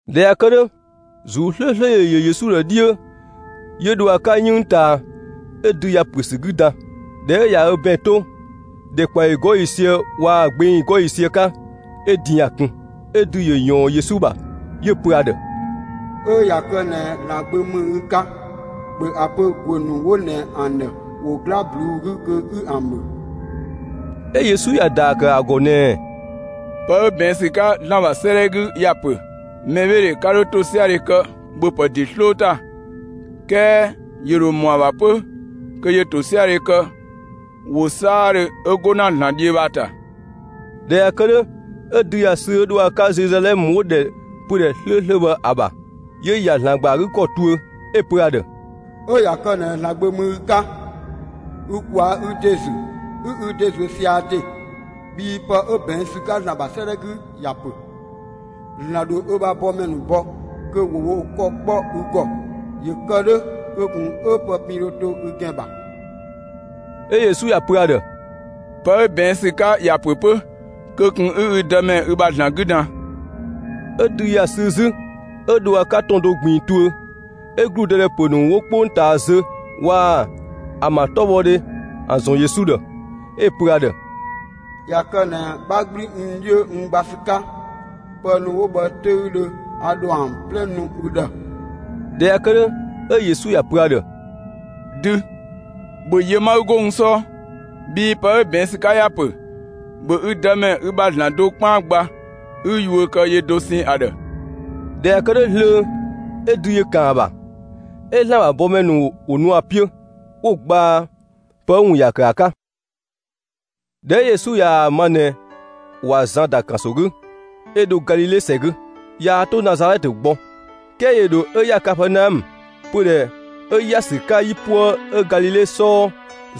꞊Dhɛ ꞊ya kë 'dhö, ‑Zuu 'slööslö ‑yö yö Yesu ‑dhë 'dhiö, 'yö dho ‑a 'ka 'yënng ꞊taa, 'ö dü ‑ya ‑püö ‑sü 'gü dan. ꞊Dhɛ 'ö ꞊ya ö ‑bɛn 'to, ‑dhɛkpaɔyi 'gɔɔ‑ ‑yiisië waa‑ gbeng 'gɔɔ‑ ‑yiisië 'ka, 'ö din ‑ya kun. 'Ö dü ‑yö ꞊yɔɔn Yesu ‑bha, 'yö‑ pö ‑a ‑dhë: «'Ö ꞊ya kë ꞊nɛ ‑Zlan Gbö ‑mü ü 'ka, ‑bhö ‑a pö ‑guö ‑nu 'wo ꞊nɛ ‑an ‑dhë ‑wo 'gla ꞊bluu'‑ 'gü kö 'ü ‑an ‑bhö!» 'Ö Yesu ‑ya ‑daa ‑kë ‑a ‑gɔ ꞊nɛɛ: «Pë 'ö ꞊bɛɛn' ‑sü 'ka ‑Zlan ‑bha 'sëëdhɛ 'gü ‑ya ‑pö: Mɛbheedhe 'ka 'dho ‑tosiadhe kë ‑bhöpë ‑de 'sloo ‑ta. 'Kɛɛ ‑yö ‑dho ‑mɔ ‑a ‑bha 'pö kö ‑yö ‑tosiadhe kë ‑wo 'saadhö 'ö 'go ‑na ‑Zlan 'dhiö bhë ‑a ‑ta.» ꞊Dhɛ ꞊ya kë 'dhö, 'ö dü ‑ya sü 'ö dho ‑a 'ka Zeluzalɛmë 'wo‑ ‑dhɛ pödhɛ 'slööslö bhë ‑a ‑bha, 'yö‑ ‑ya ‑Zlan ‑gba ‑a 'gü 'kɔ tuö. 'Ö‑ pö ‑a ‑dhë: «'Ö ꞊ya kë ꞊nɛ ‑Zlan Gbö ‑mü ü 'ka, ü ꞊kwaa'‑ ü ‑de ‑zü 'ü ü ‑de ‑zuö sia‑ ‑de! Bhii pë 'ö ꞊bɛɛn' ‑sü 'ka ‑ya ‑pö: ‑Zlan ‑dho ö ‑bha bɔmɛ ‑nu bɔ, kö ‑wo wo ‑kɔ kpɔ ü ‑gɔ, ‑yö kë 'dhö kö ꞊kun 'ö pë pin dho to ü ‑gɛn ‑bha.» 'Ö Yesu ‑ya pö ‑a ‑dhë: «Pë 'ö ꞊bɛɛn' ‑sü 'ka ‑ya ‑pö 'pö: Kö ꞊kun 'ü ü Dëmɛ ü ‑bha ‑Zlan 'gü dan!» 'Ö dü ‑ya sü 'zü 'ö dho ‑a 'ka ‑tɔn do ꞊gbiin tuö. 'Ö ‑gludëdhɛ ‑pö ‑nu 'wo 'kpongtaa zö waa‑ ‑an ‑bha 'tɔbhɔdhe ‑an ‑zɔn Yesu ‑dhë, 'ö‑ pö ‑a ‑dhë: «꞊Ya kë ꞊nɛ 'bha 'gblü n 'dhiö n gba ‑sü 'ka, pë ‑nu 'wo bhë 'töüdhö a ‑dho ‑an 'plɛ nu ü ‑dhë.» ꞊Dhɛ ꞊ya kë 'dhö, 'ö Yesu ‑ya pö ‑a ‑dhë: «Dü, ‑bhö yö 'ma 'ü 'go n 'sɔɔ, bhii pë 'ö ꞊bɛɛn' ‑sü 'ka ‑ya ‑pö: ‑Bhö ü Dëmɛ, ü ‑bha ‑Zlan dosɛn 'kpaan gba, 'ü yuö kë yö dosɛn ‑a ‑dhë!» ꞊Dhɛ ꞊ya kë 'dhö zlöö, 'ö dü ‑yö ‑kan ‑a ‑bha. 'Ö ‑Zlan ‑bha bɔmɛ ‑nu ‑wo nu ‑a 'piö, 'wo‑ gbaa pë 'ö‑ ‑wun ‑ya ‑kë ‑a 'ka. ꞊Dhɛ 'ö Yesu ꞊yaa‑ ma ꞊nɛ ꞊wa Zan ‑da ‑kanso 'gü, 'ö dho Galile ‑sɛ 'gü. Yaa 'to Nazalɛtë gbɔ, 'kɛɛ ‑yö ‑dho 'ö ‑ya Kapɛɛnaɔmë, pödhɛ 'ö ‑ya ‑sü 'ka 'yipuë 'ö Galile 'sɔɔ,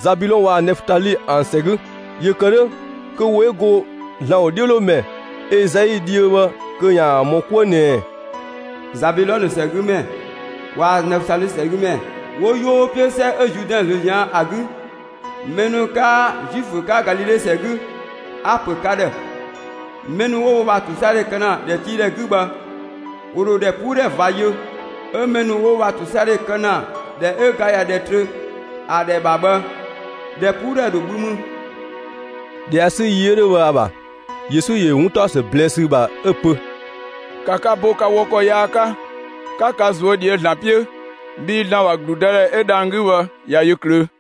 Zabilɔn waa‑ Nɛfutali ‑an ‑sɛ 'gü. ‑Yö ‑kë 'dhö, kö ‑wo 'ö go ‑Zlan ‑wodhiölomɛ Ezai dhiö bhë kö ‑yaan ‑mɔ 'kuë ꞊nɛɛ: Zabülɔnë ‑sɛgümɛ waa‑ Nɛfutali ‑sɛgümɛ 'wo 'yoo 'piö 'sɛ 'ö Zuudɛn ꞊zlöö ꞊zian' ‑a 'gü, mɛ ‑nu 'kaa Zuifö 'ka Galile ‑sɛ 'gü, a‑ ‑pö ka ‑dhë: Mɛ ‑nu 'wo wo ‑bha ‑tosiadhe kë ‑na ‑dhɛtiidhɛ 'gü bhë, ‑wo ‑dho ‑dhɛpuudhɛ ꞊va yö; 'ö mɛ ‑nu 'wo wo ‑bha ‑tosiadhe kë ‑na, ‑dhɛ 'ö ga ꞊ya ‑dhɛ trö ‑a ‑dhɛ ‑bha bhë, ‑dhɛpuudhɛ ‑dho bhü mü. ꞊Dhɛ ꞊ya 'sü yi 'ö 'dhö bhë ‑a ‑bha, Yesu ‑yö ‑yö 'wuntaɔsë ꞊blɛɛ'‑ ‑sü ‑bha 'ö‑ pö: «‑Ka ka bo ka wɔ ‑kɔ yaa 'ka, 'ka ka ꞊zuö' ꞊dhië' ‑Zlan 'piö, bhii ‑Zlan ‑bha ‑gludëdhɛ 'ö dhang‑ 'gü bhë ꞊ya yö ꞊klöö'!»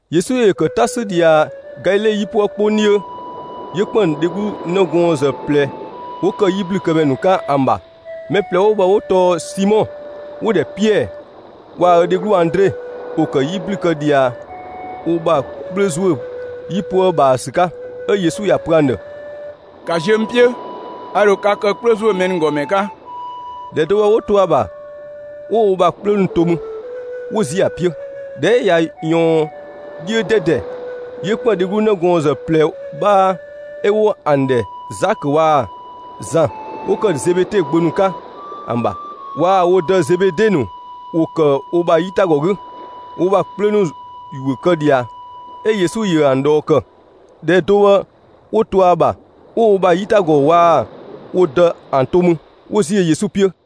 Yesu ‑yö ‑kë 'ta 'sü ꞊dhia Galile 'yipuë 'kpong 'dhiö, 'yö ‑kpën dheglu 'nëgɔɔnzë ꞊plɛ 'wo ‑kë 'yiblükëmɛ ‑nu 'ka ‑an ‑bha. Mɛ ꞊plɛ 'wo bhë 'wo tɔɔ Simɔ ('wo‑ ‑dhɛ Piɛɛ) waa‑ ö dheglu Andre; ‑wo ‑kë 'yi ‑blü kë ꞊dhia wo ‑bha 'kplö ‑zuö 'yipuë ꞊bhaa ‑sü 'ka. 'Ö Yesu ‑ya pö ‑an ‑dhë: «‑Ka ziö n 'piö; a ‑dho ka kë 'kplö ‑zuö mɛ ‑nu ‑gɔ ‑mɛ 'ka!» ‑Dhɛ do bhë 'wo to ‑a ‑bha, 'wo wo ‑bha 'kplö ‑nu to mü, 'wo ‑ziö ‑a 'piö. ꞊Dhɛ 'ö ꞊ya ꞊yɔɔn 'dhiö 'dɛdɛ, 'yö ‑kpën dheglu 'nëgɔɔnzë ꞊plɛ 'bhaa 'ö 'wo ‑an ‑dhɛ Zakö waa‑ Zan 'wo ‑kë Zebede gbö ‑nu 'ka ‑an ‑bha. Waa‑ wo dë Zebede ‑nu ‑wo ‑kë wo ‑bha 'yitagɔ 'gü, wo ‑bha 'kplö ‑nu ‑yuö kë ꞊dhia. 'Ö Yesu ‑yö ‑an ꞊dhɔɔ ‑kë. ‑Dhɛ do bhë 'wo to ‑a ‑bha, 'wo wo ‑bha 'yitagɔ waa‑ wo dë ‑an to mü, 'wo ‑ziö Yesu 'piö.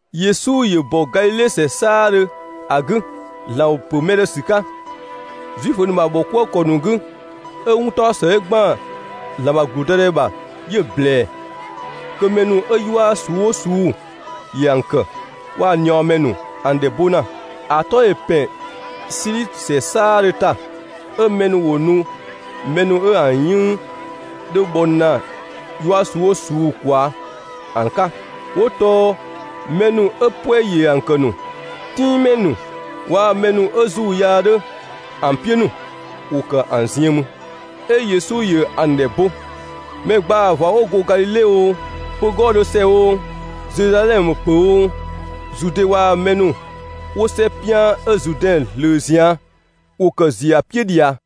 Yesu ‑yö ‑bɔ Galile ‑sɛ 'saadhö ‑a 'gü, ‑Zlan ‑wo ‑pö mɛ ‑nu ‑dhë ‑sü 'ka Zuifö ‑nu ‑bha ‑bhɔkuëkɔ ‑nu 'gü. 'Ö 'wuntaɔsë 'ö ‑gban ‑Zlan ‑bha ‑gludëdhɛ ‑bha 'yö‑ ꞊blɛɛ. Kö mɛ ‑nu 'ö 'yua ꞊suu'‑ 'oo ꞊suu'‑ ‑yö ‑an ‑kë, waa‑ ꞊niɔɔmɛ ‑nu ‑an ‑dhɛ bo ‑na. ‑A 'tɔ ‑yö ‑pɛn Sili ‑sɛ 'saadhö ‑ta. 'Ö mɛ ‑nu ‑wo nu mɛ ‑nu 'ö ‑an 'yënng 'dho bhɔ ‑na 'yua ꞊suu'‑ 'oo ꞊suu'‑ ꞊kwaa' ‑an 'ka; 'wo tɔɔ mɛ ‑nu 'ö 'puɛ‑ ‑yö ‑an kë ‑nu, 'tinngmɛ ‑nu, waa‑ mɛ ‑nu 'ö ‑zuu yaa 'dho ‑an 'piö ‑nu, ‑wo ‑kë ‑an ziën mü. 'Ö Yesu ‑yö ‑an ‑dhɛ bo. Mɛ ‑gbaa ꞊va 'wo go Galile oo, pö‑ 'gɔɔ‑ do ‑sɛ oo, Zeluzalɛmë pö‑ oo, Zude waa‑ mɛ ‑nu 'wo 'sɛ 'pian 'ö Zuudɛn ꞊zlöö ꞊zian', ‑wo ‑kë ‑ziö ‑a 'piö ꞊dhia.